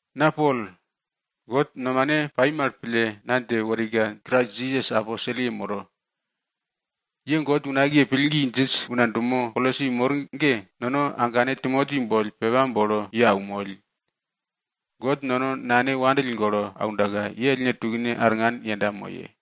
Na Pol, God nomane pai mal pille, na dje worika Krais Jisas aposelye moro. Ye God unakiye pillgi djinj una dumo Kolosi mor ge, nono agane Timoti boll pepa bolo ye aunmoll. God nono Nane ye wopake pille aundaka, ye ellne tukne arngan yenda moye.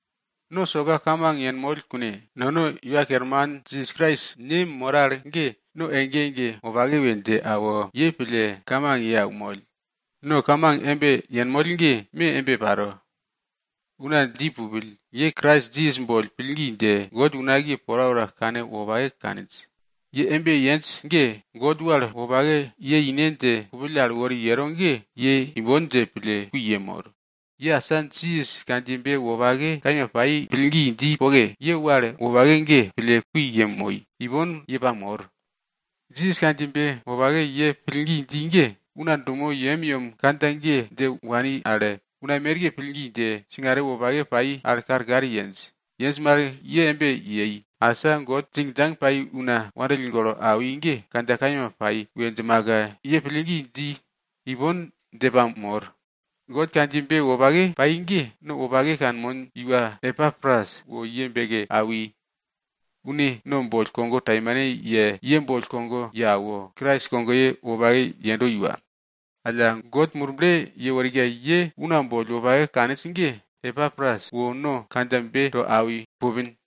No soka kamang yenmoll kune, nono Iwa Kerman Jisas Krais Ne moro al ge, no ege ege wopake we dje awo, ye pille kamang ye aunmoll. No kamang embe yenmoll ge me embe paro. Una dji pupill ge, ye Krais Jisas boll pillgi dje, God unakiye porapora kanwopake kaninj we dji. Ye embe yenj ge, God wal wopake ye ine dje kupill al wori yero ge, ye imbon dje pille kui yemor. Ye asa Jisas kandjiyebe wopake kaima pai pillgi dji poke, ye wal wopake ge pille kui yemoi, ipon para kui ye pamor. Jisas kandjiyebe wopake ye pillgi dji ge, una dumo yemyem kandja ge dje wani al, una merke pillgi dje singare wopake pai mal karkar yenj. Yenj mal ye embe yei, asa God djingdjang pai una wopake pille awi ge kandja kaima pai we djimaka ye pillgi dji, ipon dje pamor. God kandjiyebe wopake pai ge, no wopake kanmon iwa Epapras wo ye beke awi. Une no boll kogo taimane ye, alla ye boll kogo ye awo, Krais kogoye wopake yendo iwa. Alla, God Murble yeworika, ye una boll wopake kaninj ge, Epapras wo no kandjabe to awi pupin.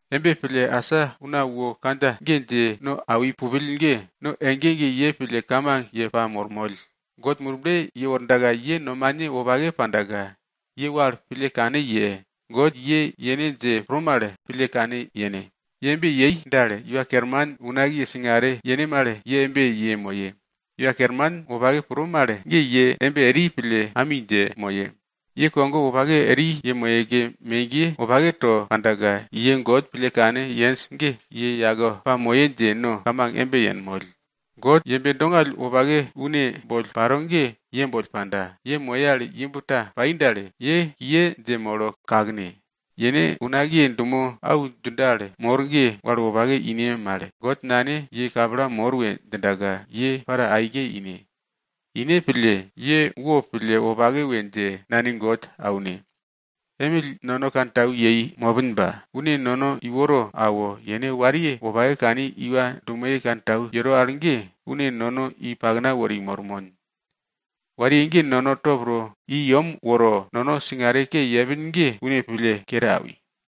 Embe pille, asa una wo kandja ge dje no awi pupill ge, no ege ege ye pille kamang ye pamormoll. God Murble yewordaka, ye nomane wopake pandaka, ye wal pille kane ye, God ye yene dje pro mal, pille kane yene. Ye embe yei dal, Iwa Kerman unakiye singare yene mal ye embe yemoye. Iwa Kerman wopake pro mal ge ye embe eri pille ami dje moye. Ye kogo wopake eri yemoyeke megiye wopake to pandaka, ye God pille kane yenj ge ye yake pamoye dje no kamang embe yenmoll. God yembe dongall wopake une boll paro ge ye boll panda, ye moye al imb ta pai dal, ye kiye dje molo kakne. Yene unakiye dumo au djindo al mor ge, wal wopake ine mal, God Nane ye kapla mor we djindaka, ye para aike ine. Ine pille, ye wopille wopake we dje Nane God aune. Emill nono kantau yei mopin ba, une nono iworo awo, yene wariye wopake kani iwa dumoye wopake kantau yero al ge, une nono i pakna wori mormon. Wariye ge nono top to i yem woro, nono singare ke yepin ge une pille kere awi.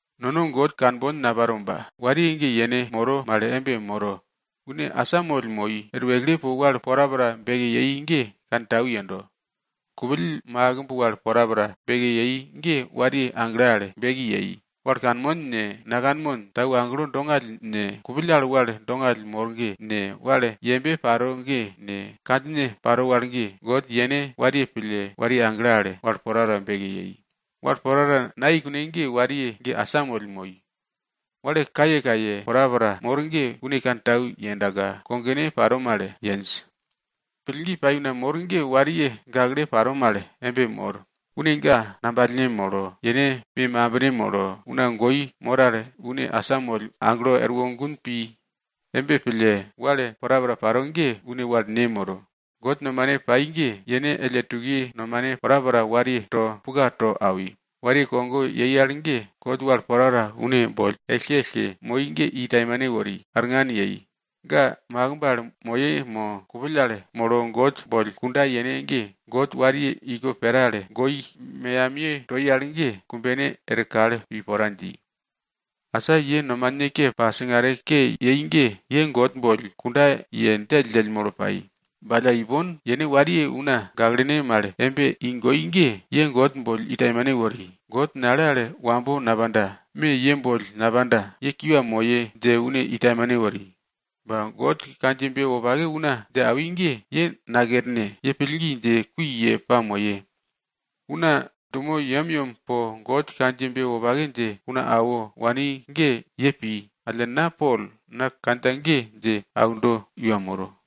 Nono God kanbon naparo ba, wariye ge yene moro mal embe moro. Une asamoll moi, er wekle po wal porapora beki yei ge kantau yendo. Kupill makimb wal porapora beki yei ge wariye agle al beki yei. Wal kanmon ne, nakanmon, tau agelo dongall ne, kupill al wal dongall mor ge ne, wal yembe paro ge ne, kandjine paro wal ge, God yene wariye pille, wariye agle al wal porapora beke yei. Wal porapora nayei kune ge wariye ge asamoll moi. Wal kayekaye porapora mor ge une kantau yendaka, kogone paro mal yenj. Pillgi pai una mor ge wariye gakle paro mal embe mor, une ga ngambalne molo, yene me mambine molo, una goi mor al une asamoll aglo erwo gun pi. Embe pille, wal porapora paro ge une wal ne moro. God nomane pai ge, yene elle tukiye nomane porapora wariye to puka to awi. Wariye kogo yei al ge God wal porapora une boll ellke ellke moi ge i taimane wori, arngan yei. Ga makimb al moye mo kupill al molo God boll kunda yene ge, God wariye iko pera al goi meyamiye toi al ge, kumbene er kal pi pora dji. Asa ye nomane ke pa singare ke yei ge, ye God boll kunda ye djelldjell molo pai. Ba alla ipon, yene wariye una gaklene mal embe i goi ge, ye God boll i taimane wori. God nale al wambo napanda, me ye boll napanda, ye kiwa moye dje une i taimane wori. Ba God kandjiyebe wopake una dje awi ge, ye nakerne. Ye pillgi dje kui ye pamoye. Una dumo yemyem po God kandjiyebe wopake dje una awo wani ge ye pi. Alla, na Pol, na kandja ge dje aundo iwa moro.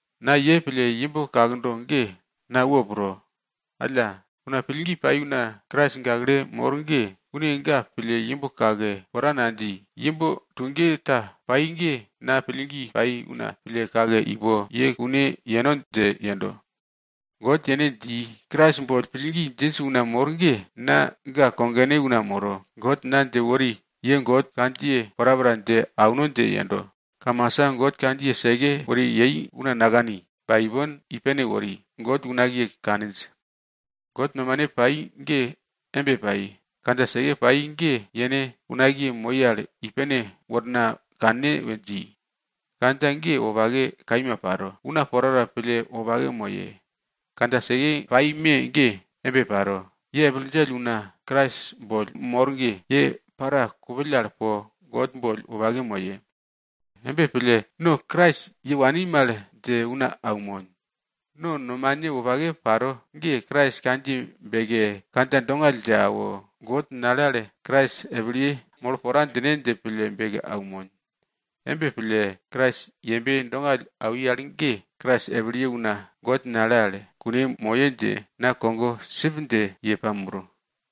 Na ye pille imb kakdo ge na wo pro. Alla, una pillgi pai una Krais gakle mor ge, une ga pille imb kake pora nadji. Imb tuge ta pai ge na pillgi pai una pille kake i po ye kune yeno dje yendo. God yene dji, Krais boll pillgi djinj una mor ge, na ga kogone una moro. God na dje wori ye God kandjiye porapora dje auno dje yendo. Kamasa God kandjiye seke wori yei, una nakani. Ba ipon i pene wori, God unakiye kaninj. God nomane pai ge embe pai, kandja seke pai ge yene unakiye moi al i pene worna kanne we dji. Kandja ge wopake kaima paro, una porapora pille wopake moye. Kandja seke pai me ge embe paro, ye epil djell una Krais boll mor ge, ye para kupill al po God boll wopake moye. Embe pille, no Krais ye wani mal dje una aunmon. No nomane wopake paro ge, Krais kandjiye beke, kandja dongall dje awo, God nale al Krais epilye molo pora djine dje pille beke aunmon. Embe pille, Krais yembe dongall awi al ge, Krais epilye una God nale al kune moye dje na kogo sipdje ye pamoro.